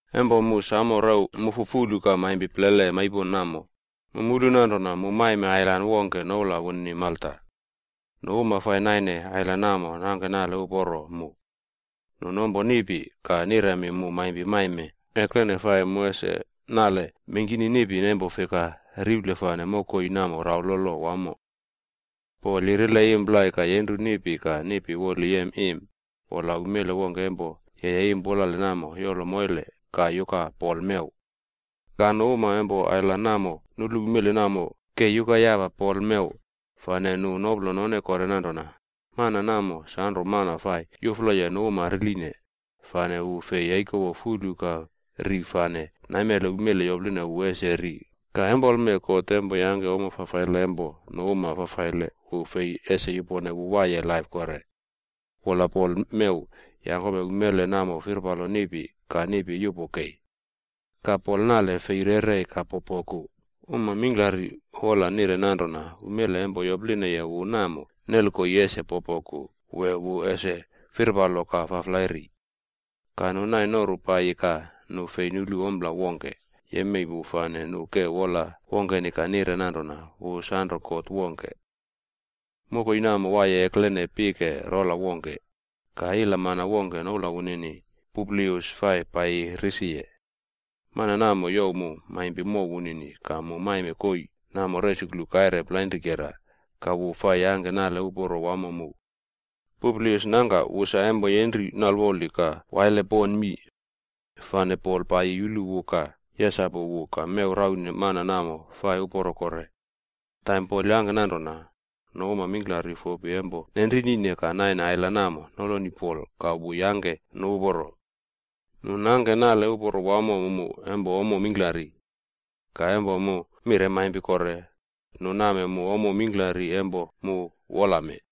Empo mu samo rew mufu fulu ka maimpi plele maipon namo, mu mulu nanrona mu maime ailan wongke noula wunini Malta. Nu uma fai naine ailan namo nangke nale uporo mu. Nu nompo niꞌpi ka niremi mu maimpi maime eklene fai mu ese nale mengkini niꞌpi empo fika riple fane mokoi namo raulolo wamo. Pol yirile im plai ka yenru niꞌpi ka niꞌpi woli yem im, wola umele wongke empo yeye im pulale namo yolo moile ka yuka Pol mew. Ka nu uma empo ailan namo nulu umele namo ke yuka yapa Pol mew, fane nu noplo none kore nanrona, “Mana namo sanro mana fai yufloye nu uma riline, fane wu fei yaikowo fulu ka ri fane naimele umele yopline wu ese ri ka empolme god empo yangke ommo fafaile empo nu uma fafaile wu fei ese yupone wu waiye laip kore.” Wola Pol mew yangkome umele namo firpalo niꞌpi ka niꞌpi yupo kei. Ka Pol nale fei rerei ka popoku. Uma mingklari wola nire nanrona umele empo yoplineye wu namo nel koii ese popoku wee wu ese firpalo ka faflai ri. Ka nu nai noru paiyi ka nu fei nulu ompla wongke yemei wu fane nu ke wola wongkeni ka nire nanrona wu sanro god wongke. Mokoi namo waiye eklene pike rola wongke, ka ila mana wongke noula wunini Publius fai paiyi risiye. Mana namo youw mu maimpi mow wunini ka mu maime koii namo resuklu kaire plainrikera ka wu fai yangke nale uporo wamo mu. Publius nangka wu sa empo yenri nalwoli ka waile pon mii. Fane Pol paiyi yulu wu ka yesapu wu ka mew raune mana namo fai uporo kore. Empo Pol yangke nanrona, nu uma mingklari fopi empo nenrinine ka naine ailan namo noloni Pol ka wu yangke nu uporo. Nu nangke nale uporo wamo mu empo ommo mingklari. Ka empo mu mire maimpi kore, nu name mu ommo mingklari empo mu wola mee.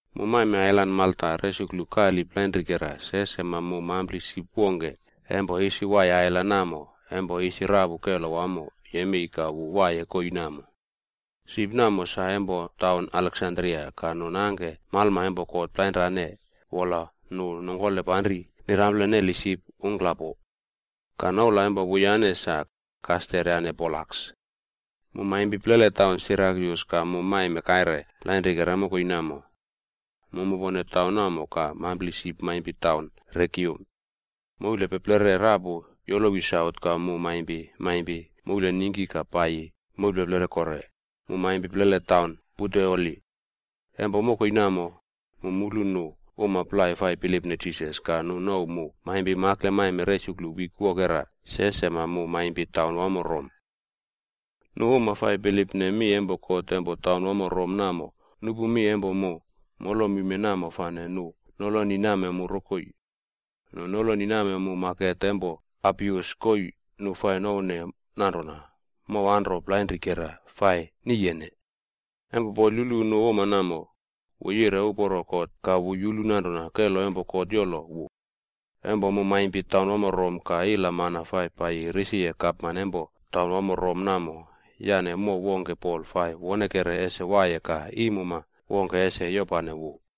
Mu maime ailan Malta resuklu kali plainrikera se sema mu mampli sip wongke empo isi waiye ailan namo empo isi rapu kelo wamo yemei ka wu waiye koii namo. Sip namo sa empo taun Aleksandria ka nu nangke malma empo god plainrane wola nu nongkole panri nirample neli sip ungklapo. Ka noula empo wuyane sa, Kaster yane Polaks. Mu maimpi plele taun Sirakyus ka mu maime kaire plainrikera mokoi namo. Mu mupone taun namo ka mampli sip maimpi taun Regium. Moulpeplere rapu yolowi saut ka mu maimpi maimpi moulningki ka paiyi moulpeplere kore, mu maimpi plele taun Puteoli. Empo mokoi namo, mu mulu nu uma plai fai bilipne Jisas ka nu nouw mu maimpi makle maime resuklu wik wokera se sema mu maimpi taunwamo Rom. Nu uma fai bilipne mi empo God empo taunwamo Rom namo nupu mi empo mu molomime namo fane nu noloni name mu rokoi. Nu noloni name mu maket empo Apius koii nu fai nouwne nanrona Mow Anro Plainrikera fai niyene. Empo Pol yulu nu uma namo, wu yire uporo God ka wu yulu nanrona kelo empo God yolo wu. Empo mu maimpi taunwamo Rom ka ila mana fai paiyi risiye gapman empo taunwamo Rom namo yane mow wongke Pol fai wonekere ese waiye ka iimuma wongke ese yopane wu.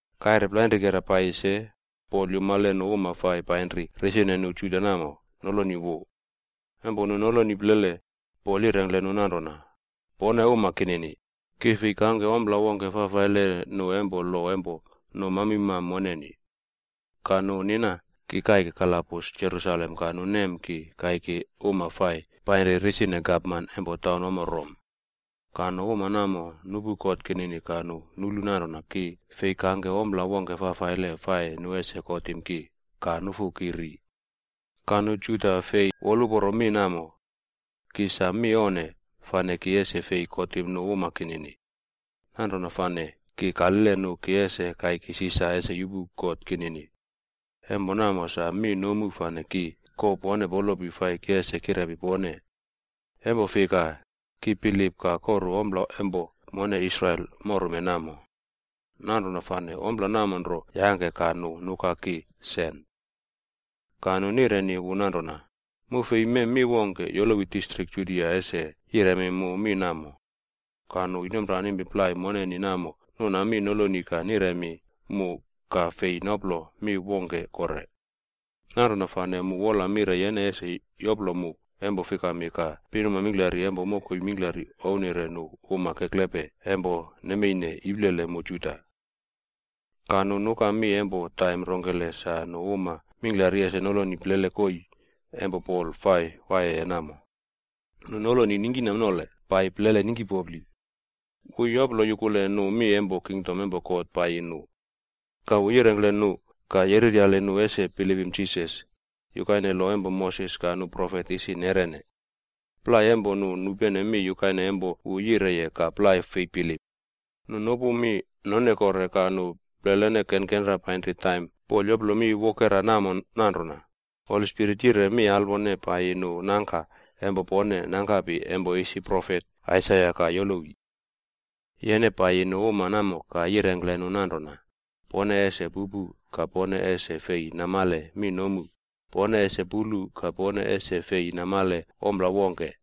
Kaire plainrikera paiyi se, Pol yumale nu uma fai painri risine nu Juda namo noloni wu. Empo nu noloni plele, Pol yirengkle nu nanrona, “Pone uma kinini, ki fei kangke ompla wongke fafaile nu empo lo empo nu mamimam moneni. Ka nu nina ki kaike kalabus Jerusalem ka nu nem ki kaiki nu uma fai painri risine gapman empo taunwamo Rom. Ka nu uma namo nupu kot kinini ka nu nulu nanrona ki fei kangke ompla wongke fafaile fai nu ese kotim ki ka nufu ki ri. Ka nu Juda fei woluporo mi namo. Ki sa mi onne fane ki ese fei kotim nu uma kinini. Nanrona fane ki kalile nu ki ese kaiki Sisar ese yupu kot kinini. Empo namo sa mi nomu fane ki kouw pone polopi fai ki ese kirepi pone. Empo fika, ki bilip ka koru ompla empo mone Israel morume namo. Nanrona fane ompla namo nro yangke ka nu nuka ki sen.” Ka nu nireni wu nanrona, “Mu fei mem mi wongke yolowi distrik Judia ese yiremi mu mi namo. Ka nu inomranimpi plai moneni namo nuna mi noloni ka niremi mu ka fei noplo mi wongke kore. Nanrona fane mu wola mire yene ese yoplo mu empo fikami ka pinuma mingklari empo mokoi mingkla ownire nu uma keklepe empo nemeine iplele mu Juda.” Ka nu nuka mi empo taim rongkele sa nu uma mingklari ese noloni plele koii empo Pol fai waiyeye namo. Nu noloni ningkinamnole paiyi plele ningkipopli. Wu yoplo yukule nu mi empo kingdom empo God paiyi nu. Ka wu yirengkle nu ka yereryali nu ese bilipim Jisas, yukaine lo empo Moses ka nu Profet isi neꞌrene. Plai empo nu nupene mi yukaine empo wu yireye ka plai fei bilip. Nu nopu mi none kore ka nu plelene kenkenra painri taim Pol yoplo mi wokera namo nanrona, “Holi Spirit yire mi alwone paiyi nu nangka empo pone nangkapi empo isi profet Aisaia ka yolowi. ‘Yene paiyi nu uma namo ka yirengkle nu nanrona, “Pone ese pupu ka pone ese fei namale mi nomu, pone ese pulu ka pone ese fei namale ompla wongke.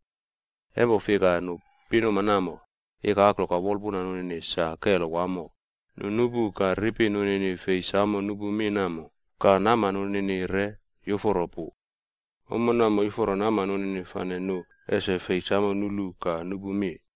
Empo fika, nu pinuma namo, ikaklo ka wolpuna nunini sa kelo wamo, nu nupu, ka ripi nunini fei samo nupu mi nomu ka nama nunini re yuforo pu. Ommo namo yuforo nama nunini fane nu ese fei samo nulu ka nupu mi.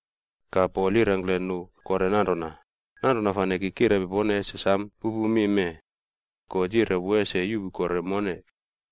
Ka Pol yirengkle nu kore nanrona, “Nanrona fane ki kirepi pone ese sam pupu mi mee. God yire wu ese yuꞌpu kore mone.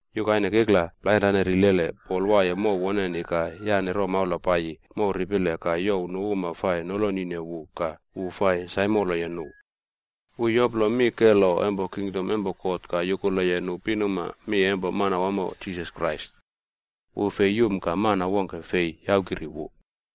Yukaine kikla plainrane rilele c Pol waiye mow woneni ka yane romaula paiyi mow ripile ka youw nu uma fai nolonine wu ka wu fai saimoloye nu. Wu yoplo mi kelo empo kingdom empo God ka yukuleye nu pinuma mi empo Manawamo Jisas Krais. Wu fei yum ka mana wongke fei yaukiri wu.